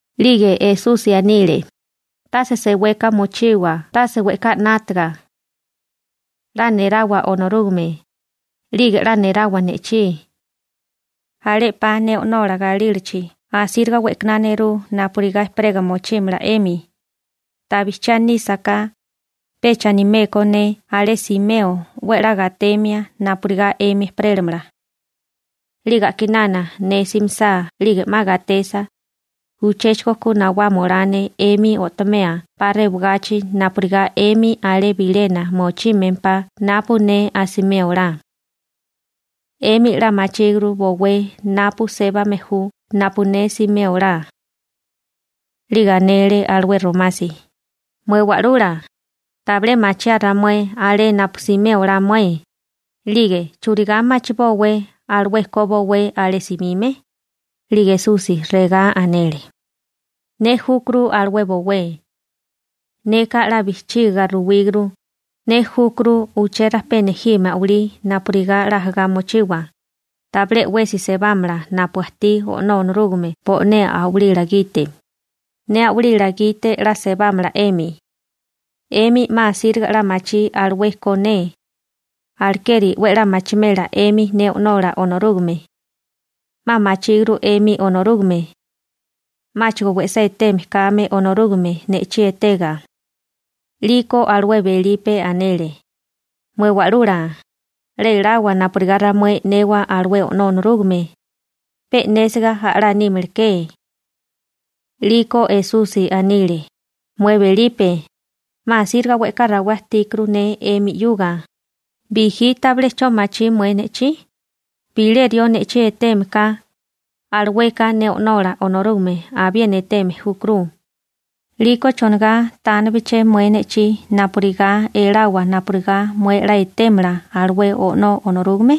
'Lige Esusi anile: ―Tase seweka mochiwa tase we'ká 'nátiga. 'La nerawa Onorúgame, 'lige 'la nerawa ne'chí. Alé 'pa ne O'nola galílachi asíriga we'kaná nerú napurigá ejperega mochímala 'emi. Ta bijchiá nísaká, pecha animé ko ne alé simeo 'we a'lá gatemia napurigá 'emi ejperélamala. 'Lige a'kinana ne simisá 'lige 'ma gatesa, uchéchigo ku nawama olá ne 'emi o'tomea 'pa rewagachi napurigá 'emi alé bilena mochímempá napu ne asimé olá. 'Émi 'la machíguru bowé napu sébame ju napu ne simé olá. 'Lige anele alué Romasi: ―Mué Wa'lula, tabilé machiaa ramué alé napu simé olá mué. 'Lige ¿churigá machibówé alué ko bowé alé simime? 'Lige Esusi regá anele: ―Ne júkuru alué bowé. Neka 'la bijchiga ruwíguru, ne júkuru uché rajpé nejime a'walí napurigá 'la ajagá mochiwa. Tabilé 'wesi sebámala napu ajtí O'nó Onorúgame bo'né a'walila gite, ne a'walila gite 'la sebámala 'emi. 'Emi 'ma asíriga 'la machí alué ko ne. Alekeri 'we a'lá machimela 'emi ne O'nola Onorúgame. 'Ma machíguru 'emi Onorúgame, 'máchigo we'sá eteme kame Onorúgame, ne'chí etega. 'Liko alué Belipe anele: ―Mué Wa'lula, 'la elawa napurigá ramué e'newa alué O'nó Onorúgame. Pe e'nésiga a'lá nímaleké. 'Liko Esusi anile: ―Mué Belipe, 'ma asíriga we'ká rawé ajtíkuru ne 'emi 'yuga, ¿bijí tabilé 'cho machí mué ne'chí? Bilé rió ne'chí eteme ka, alueka ne O'nola Onorúgame abiena eteme júkuru. 'Liko ¿chonigá tánebeché mué ne'chí napurigá elawa napurigá mué 'la etémala alué O'nó Onorúgame?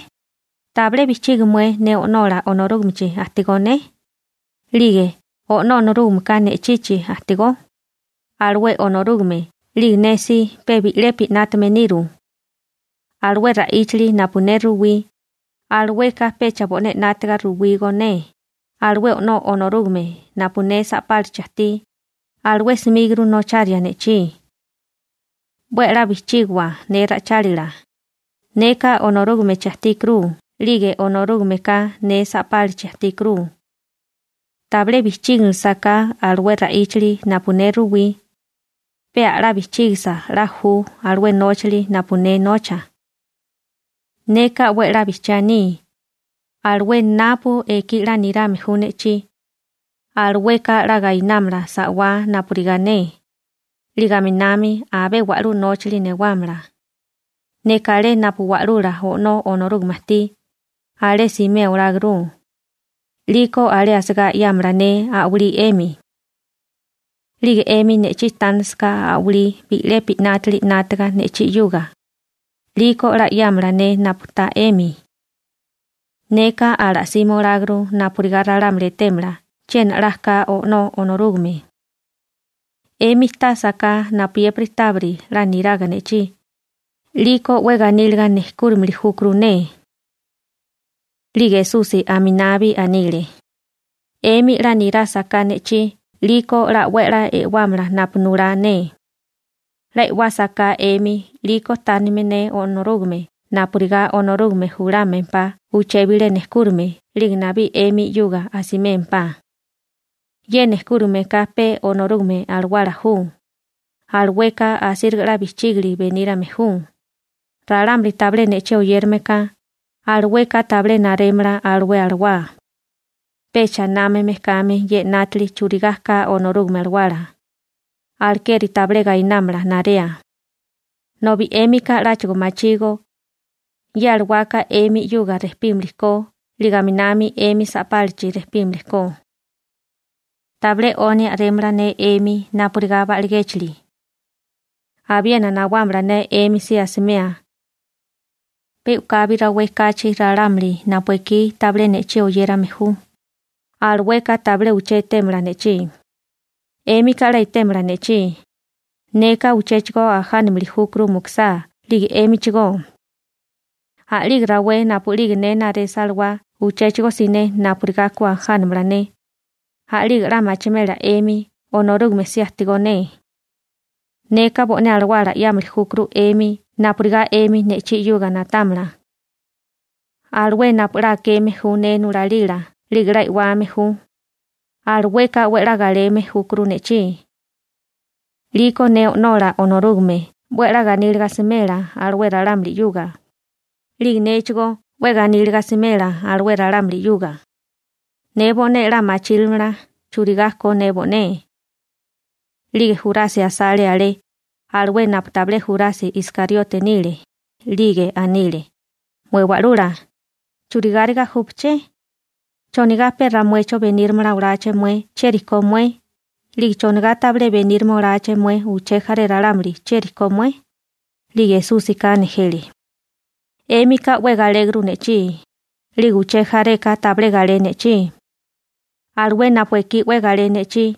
¿Tabilé bijchigi mué ne O'nó Onorúgamechi ajtigó ne 'lige O'nó Onorúgameka ne'chichi ajtigó? Alué Onorúgame 'lige ne si pe bi'lepi 'nátame niru. Alué ra'íchili napu ne ruwí, alueka pecha bo'né 'nátiga ruwígó ne, alué O'nó Onorúgame napu ne sa'pálachi ajtí, alué 'smíguru nocharia ne'chí. 'We a'lá bijchígiwa ne ra'ichálila, neka Onorúgamechi ajtíkuru 'lige Onorúgameka ne sa'pálachi ajtíkuru. Tabilé bijchíginilisaká alué ra'íchali napu ne ruwí, pe a'lá bijchígisa 'la ju alué nóchali napu ne nocha. Neka 'we a'lá bijchiá aní, alué napu ekí 'la nirame ju ne'chí, alueka 'la gainámala sa'wá napurigá ne, 'lige aminami abé wa'lú nóchali newámala. Neka alé napu wa'lula O'nó Onorúgame ajtí, alé simé oláguru. 'Liko alé asigá 'yámala ne a'walí 'emi. 'Lige 'emi ne'chí tánasaká a'walí bi'lepi 'nátili 'nátaga ne'chí 'yuga, 'liko 'la 'yámala ne napu ta 'emi. Neka ala'sima oláguru napurigá ralámuli etémala chiena 'la ka O'nó Onorúgame. 'Emi tásaká napuyépiri tábiri 'la niraga ne'chí, 'liko 'we ganíliga nejkúrimili júkuru ne. 'Lige Esusi aminabi anile: ―'Emi 'la nirásaká ne'chí 'liko 'la 'we a'lá e'wámala napu nulá ne. 'La e'wásaká 'emi 'liko tánime ne Onorúgame napurigá Onorúgame julámempá uché bilé nejkúrame 'lige nabí 'emi 'yuga asimémpá. Ye nejkúrame ka pe Onorúgame Alawala ju, alueka asíriga 'la bijchígili benírame ju. Ralamuli tabilé ne'chí oyérame ka, alueka tabilé narémala alué alawá, pecha námame kame ye 'nátili churigá ka Onorúgame Alawala, alekeri tabilé gainámala narea, nobi 'émika 'láchigo machígó. Ye alawaka 'emi 'yuga rejpímili ko 'lige aminami 'emi sapálachi rejpímili ko. Tabilé 'oni a'rémala ne 'emi napurigá ba'ligéchili. Abiena nawámala ne 'emi si asimea. Pe u'kabi rawé kachi ralámuli napu ekí tabilé ne'chí oyérame ju, alueka tabilé uché etémala ne'chí, 'émika 'la etémala ne'chí. Neka uchéchigo ajánamili júkuru mukusá 'lige 'émichigó. A'lige rawé napu'lige ne naresa alawá uchéchigo siné napurigá ku ajánamala ne, a'lige 'la machimela 'emi Onorúgame si ajtigó ne. Neka bo'né alawala 'yámili júkuru 'emi napurigá 'emi ne'chí 'yuga na'támala. Alué napu 'la akeme ju ne nulalila 'lige 'la e'wame ju, alueka 'we a'lá galeme júkuru ne'chí. 'Liko ne O'nola Onorúgame 'we a'lá ganíliga asimela alué ralámuli 'yuga, 'lige néchigó 'we ganíliga asimela alué ralámuli 'yuga. Ne bo'né 'la machírimala churigá ko ne bo'né. 'Lige Jurasi asale alé, alué napu tabilé Jurasi Iskariote nile, 'lige anile: ―Mué Wa'lula, ¿churigáriga júpaché? ¿Chonigá pe ramuecho benírama oláché mué chieri ko mué, 'lige chonigá tabilé benírama oláché mué uché jaré ralámuli chieri ko mué? 'Lige Esúsika nejele. ―'Émika 'we galéguru ne'chí, 'lige uché jareka tabilé galé ne'chí. Alué napu ekí 'we galé ne'chí,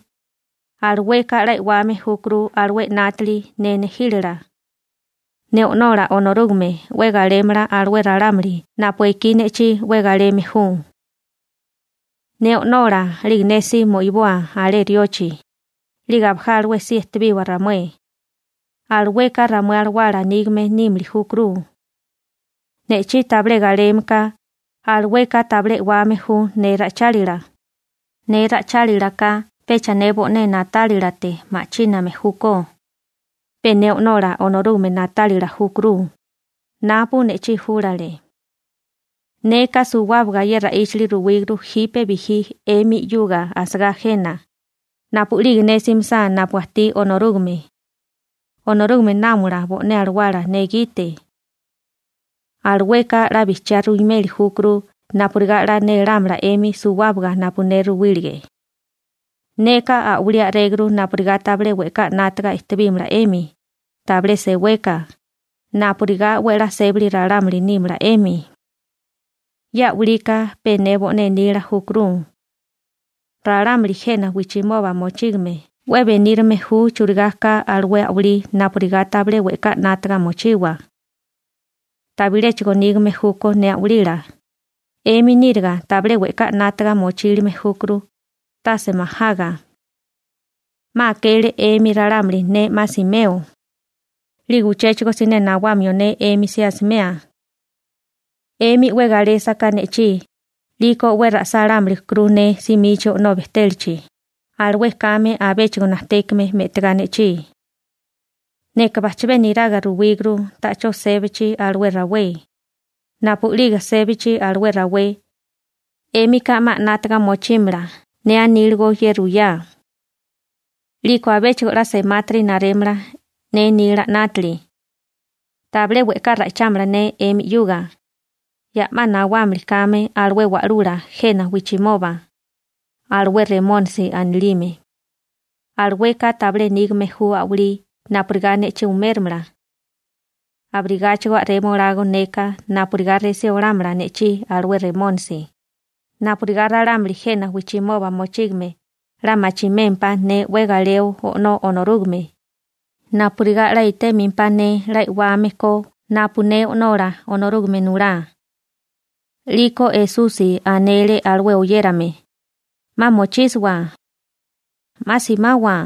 alueka 'la e'wame júkuru alué 'nátili ne nejílala. Ne O'nola Onorúgame 'we galémala alué ralámuli napu ekí ne'chí 'we galeme ju. Ne O'nola 'lige ne si mo'iboa alé riochi, 'lige abalé ejperélawa ramué. Alueka ramué alawala nígame nímili júkuru. Ne'chí tabilé galeme ka, alueka tabilé e'wame ju ne ra'ichálila. Ne ra'ichálilaka pecha ne bo'né na'tálilate ma'chíname júkó, pe ne O'nola Onorúgame na'tálila júkuru, napu ne'chí júlale. › Neka suwábaga ye ra'íchili ruwíguru jipe bijí 'emi 'yuga asagá jena. Napu'lige ne simisá napu Onorúgame ajtí, Onorúgame náomala bo'né alawala ne gite. Alueka 'la bijchiá ruimeli júkuru napurigá 'la nélámala 'emi suwábaga napu ne ruwílige. › Neka a'walí a'réguru napurigá tabilé we'ká 'nátaga ejtebímala 'emi, tabilé seweka, napurigá 'we a'lá sébali ralámuli nímala 'emi. Ye a'walika pe ne bo'né nila júkuru. Ralámuli jena wijchimoba mochígame 'we benírame ju churigá ka alué a'walí napurigá tabilé we'ká 'nátaga mochiwa, tabiléchigo nígame júkó ne a'walila. 'Emi níriga tabilé we'ká 'nátaga mochílime júkuru, tase majaga. 'Ma akele 'emi ralámuli ne 'ma simeo, 'lige uchéchigo siné nawamio ne 'emi si asimea. 'Emi 'we galésaká ne'chí, 'liko 'we ra'sálámilikuru ne simichi O'nó bejtélachi, alué kame abéchigo najtékame me'tigá ne'chí. Neka bajchabé neraga ruwíguru ta'chó sébachi alué rawé. Napu'lige sébachi alué rawé, 'émika 'ma 'nátaga mochímala ne aníligo ye ruyá. 'Liko abéchigo 'la semátiri narémala ne nila 'nátili. › Tabilé we'ká ra'ichámala ne 'emi 'yuga, ya'má nawámili kame alué wa'lula jena wijchimoba, alué Remónisi anilime. Alueka tabilé nígame ju a'walí napurigá ne'chí uméramala. Abirigáchigo a'rema olágó neka napurigá resí olámala ne'chí alué Remónisi, napurigá ralámuli jena wijchimoba mochígame 'la machimémpá ne 'we galeo O'nó Onorúgame, napurigá 'la etémempá ne 'la e'wame ko napu ne O'nola Onorúgame nulá. 'Liko Esusi anele alué oyérame: ―'Ma mochísiwa. 'Ma simawa.